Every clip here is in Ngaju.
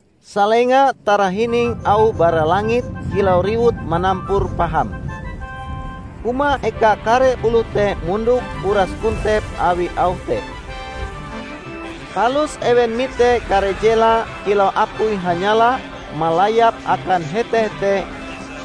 Salenga tarahining auh bara langit kilau riwut manampur paham. Huma eka kare oloh te mondok uras kontep awi auh te. Palus ewen mite kare jela kilau apui hanyala malayap akan hete-hete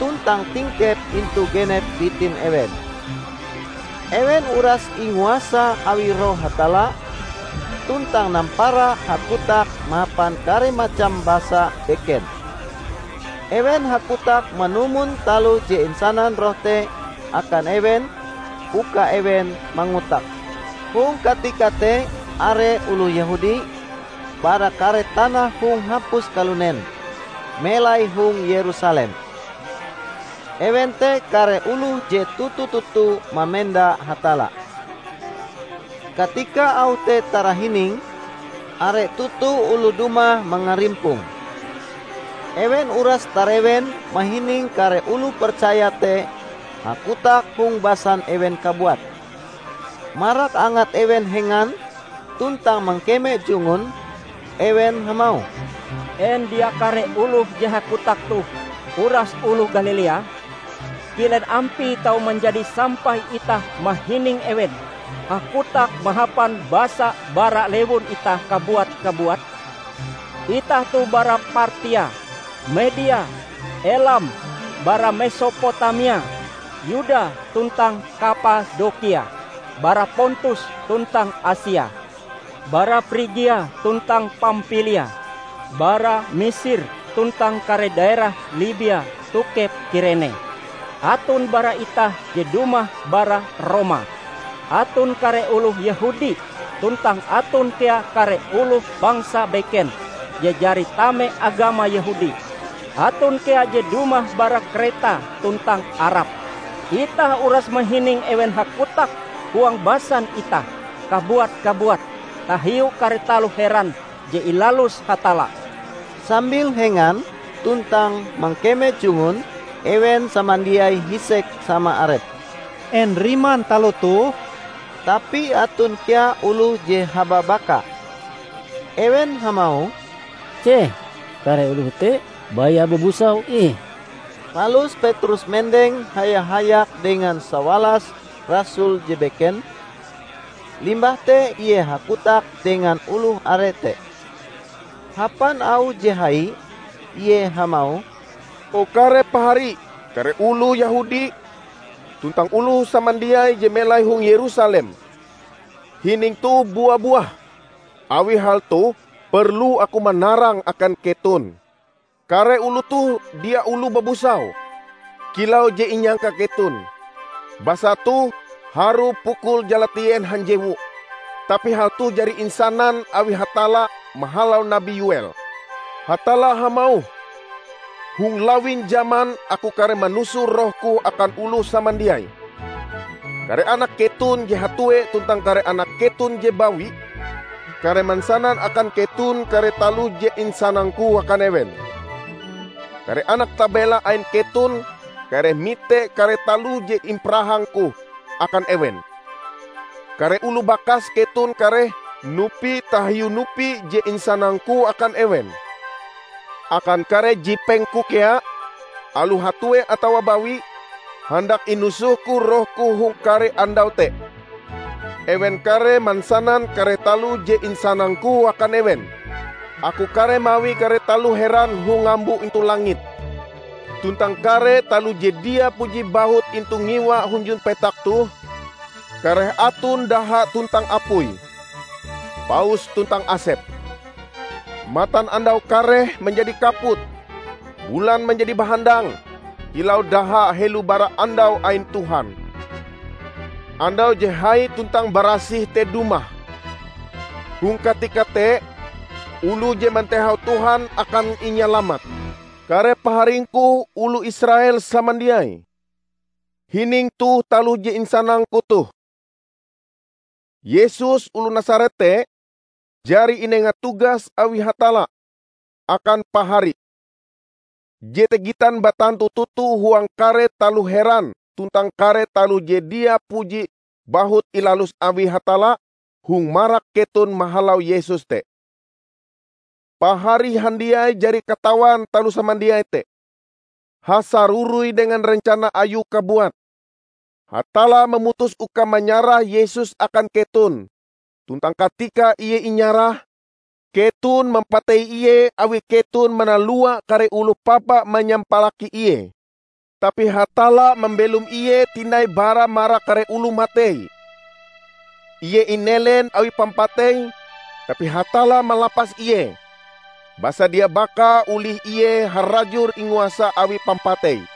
tuntang tingkep intu genep bitin ewen. Ewen uras inguasa awi Roh Hatalla, tuntang nampara hakotak mahapan kare macam basa beken. Ewen hakotak manumon taloh je insanan Roh te akan ewen uka ewen mangotake. Hong katika te are oloh Yehudi, bara kare tanah hong hapus kalunen, melai hong Yerusalem. Ewen te kare oloh je toto-toto mamenda Hatalla. Katika auh te tarahining, are toto oloh dumah mangarimponge. Ewen uras tarewen mahining kare oloh percaya te hakotak hong basan ewen kabuat. Marak angat ewen hengan tuntang mangkeme jungun, ewen hamauh, "En dia kare oloh je hakotak toh uras oloh Galilea? Kilen ampie tau manjadi sampai itah mahining ewen hakotak mahapan basa bara lewun itah kabuat-kabuat? Itah toh bara Partia, Media, Elam; bara Mesopotamia, Yuda tuntang Kapadokia; bara Pontus tuntang Asia, bara Prigia tuntang Pampilia, bara Misir tuntang kare daerah Libia tokep Kirene; aton bara itah je dumah bara Roma, aton kare oloh Yehudi tuntang aton kea kare oloh bangsa beken je jari tame agama Yehudi; aton kea je dumah bara Kreta tuntang Arab. Itah uras mahining ewen hakotak huang basan itah kabuat-kabuat tahiu kare taloh heran je ilalus Hatalla!" Sambil hengan tuntang mangkeme jungun, ewen samandiai hisek sama arepe, "En riman taloh toh?" Tapi aton kea oloh je hababaka. Ewen hamauh, "Ceh, kare oloh te baya babusau ih!" Palus Petrus mendeng haya-hayak dengan sawalas rasul je beken, limbah te ie hakotak dengan oloh are te. Hapan auh je hai, ie hamauh, "O kare pahari, kare oloh Yehudi tuntang oloh samandiai je melai hong Yerusalem! Hining toh bua-buah, awi hal toh perlu aku manarange akan keton. Kare oloh toh dia oloh babusau, kilau je inyangka keton; basa toh harue pukul jalatien hanjewu. Tapi hal toh jari insanan awi Hatalla mahalau nabi Yo"el: Hatalla hamauh, 'Hong lawin jaman Aku kareh manusoh Rohku akan oloh samandiai. Kare anak keton je hatue tuntang kare anak keton je bawi kareh mansanan akan keton kare taloh je insanang-Ku akan ewen. Kare anak tabela ain keton kareh mite kare taloh je imparahang-Ku akan ewen. Kare oloh bakas keton kareh nupi tahiu nupi je insanang-Ku akan ewen. Akan kare jipeng-Ku kea -- aloh hatue atawa bawi --, handak inusoh-Ku Roh-Ku hong kare andau te. Ewen kareh mansanan kare taloh je insanang-Ku akan ewen. Aku kareh mawi kare taloh heran hong ngambo intu langit, tuntang kare taloh je dia puji bahut intu ngiwa hunjun petak toh; kareh aton daha tuntang apui, paus tuntang asep. Matanandau kareh manjadi kaput, bulan manjadi bahandang kilau daha helo bara andau ain Tuhan, andau je hai tuntang barasih te dumah. Hong katika te, oloh je mantehau Tuhan akan inyalamat.' Kare paharingku oloh Israel samandiai! Hining toh taloh je insanangku toh: Yesus oloh Nasaret te jari inenga tugas awi Hatalla akan pahari. Jete gitan batantu toto huang kare taloh heran tuntang kare taloh je dia puji bahut ilalus awi Hatalla hong marak keton mahalau Yesus te. Pahari handiai jari katawan taloh samandiai te. Hasaroroi dengan rencana Ayue kabuat, Hatalla mamutus uka manyarah Yesus akan keton. Tuntang katika Ie inyarah, keton mampatei Ie awi keton manalua kare oloh papa manyampalaki Ie. Tapi Hatalla mambelom Ie tinai bara marak kare oloh matei. Ie inelen awi pampatei, tapi Hatalla malapas Ie, basa dia baka olih Ie harajur inguasa awi pampatei.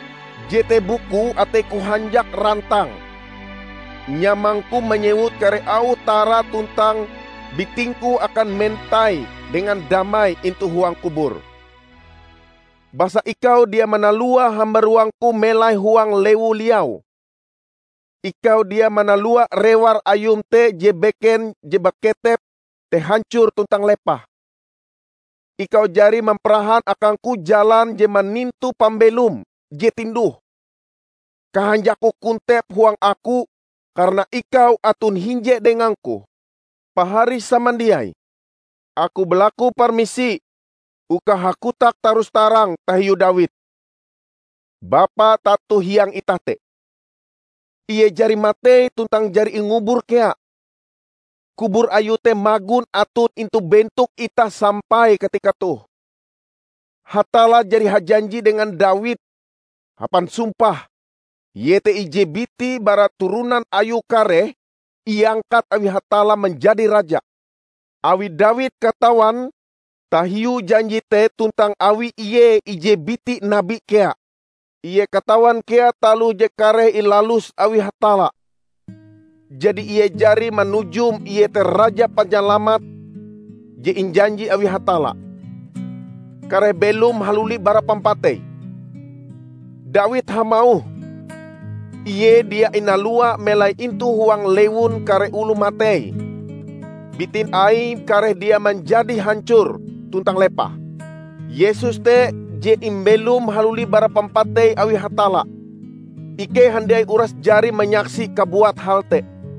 Jete bukue ateiku hanjak rantang, nyamangku manyewut kare auh tara: tuntang bitingku akan mentai dengan damai intu huang kubur. Basa ikau dia manalua hambaruangku melai huang lewu liau. Ikau dia manalua rewar Ayum je beken je baketep te hancor tuntang lepah. Ikau jari mamparahan akangku jalan je manintu pambelom je tinduh. Kahanjakku kontep huang aku karana ikau aton hinje dengangku.' Pahari samandiai, aku balaku permisi uka hakotak tarus-tarang tahiu Dawid, bapa tato hiang itah te. Ie jari matei tuntang jari ingubur kea; kubur ayue te magon aton intu bentok itah sampai katika toh. Hatalla jari hajanji dengan Dawid, hapan sumpah, iete, ije biti bara turonan ayue kareh iangkat awi Hatalla manjadi Raja. Awi Dawid katawan tahiu janji te tuntang awi ie ije biti nabi kea, Ie katawan kea taloh je kareh ilalus awi Hatalla. Jadi ie jari manujum iete Raja Panyalamat je injanji awi Hatalla, kareh belom haluli bara pampatei. Dawid hamauh, 'Ie dia inalua melai intu huang lewun kare oloh matei; bitin Aie kareh dia manjadi hancor tuntang lepah.' Yesus te je imbelom haluli bara pampatei awi Hatalla. Ikei handiai uras jari manyaksi kabuat hal te.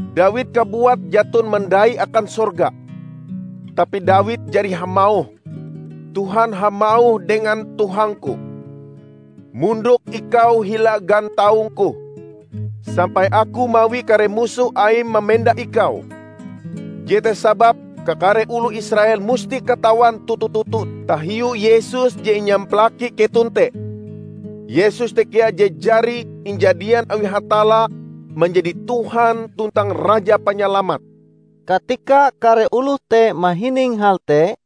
Dawid kabuat jaton mandai akan sorga, tapi Dawid jari hamauh, 'Tuhan hamauh dengan Tuhangku: Mondok ikau hila gantaung-Ku, sampai Aku mawi kare musoh Aim mamenda Ikau!' Jete sababe kakare oloh Israel musti katawan toto-toto tahiu Yesus je inyampalaki keton te, Yesus te kea je jari injadian awi Hatalla manjadi Tuhan tuntang Raja Panyalamat!" Katika kare oloh te mahining hal te,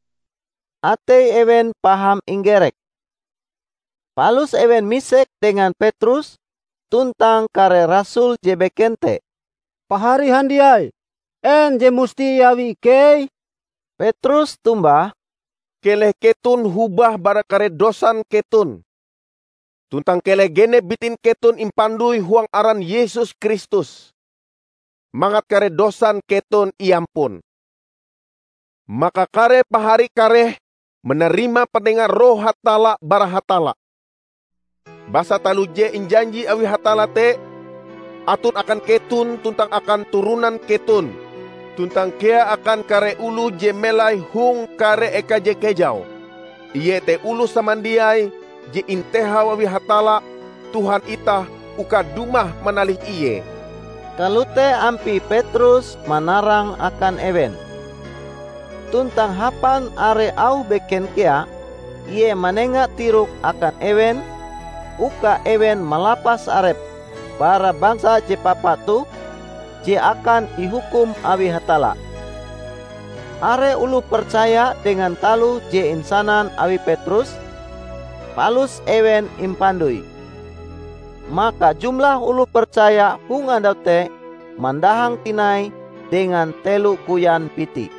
atei ewen paham inggerek. Palus ewen misek dengan Petrus tuntang kare rasul je beken te, "Pahari handiai, en je musti iawi ikei?" Petrus tombah, "Keleh keton hobah bara kare dosan keton. Tuntang keleh genep bitin keton impandoi huang aran Yesus Kristus, mangat kare dosan keton iampun. Maka kare pahari kareh manarima panengan Roh Hatalla bara Hatalla. Basa taloh je injanji awi Hatalla te aton akan keton tuntang akan turonan keton tuntang kea akan kare oloh je melai hong kare eka je kejau -- iete oloh samandiai je intehau awi Hatalla Tuhan itah uka dumah manalih Ie." Kalote ampie Petrus manarang akan ewen. Tuntang hapan are auh beken kea Ie manenga tirok akan ewen uka ewen malapas arepe bara bangsa je papa toh je akan ihukum awi Hatalla. Are oloh percaya dengan taloh je insanan awi Petrus, palus ewen impandoi. Maka jumlah oloh percaya hong andau te mandahang tinai dengan telo koyan biti.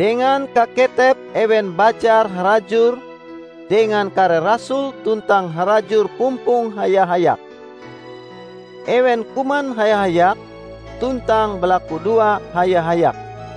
Dengan kaketepe ewen bajar harajur dengan kare rasul tuntang harajur pumpong haya-hayak. Ewen kuman haya-hayak tuntang balakudoa haya-hayak.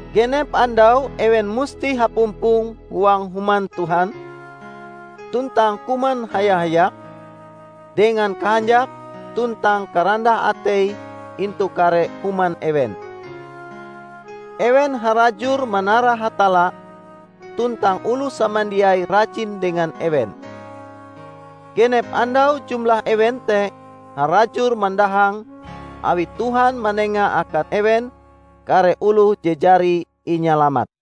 Genep andau ewen musti hapumpong huang Human Tuhan: tuntang kuman haya-hayak, dengan kahanjak tuntang karandah atei intu kare human ewen. Ewen harajur manara Hatalla tuntang oloh samandiai rajin dengan ewen. Genep andau jumlah ewen te harajur mandahang awi Tuhan manenga akan ewen kare oloh je jari inyalamat.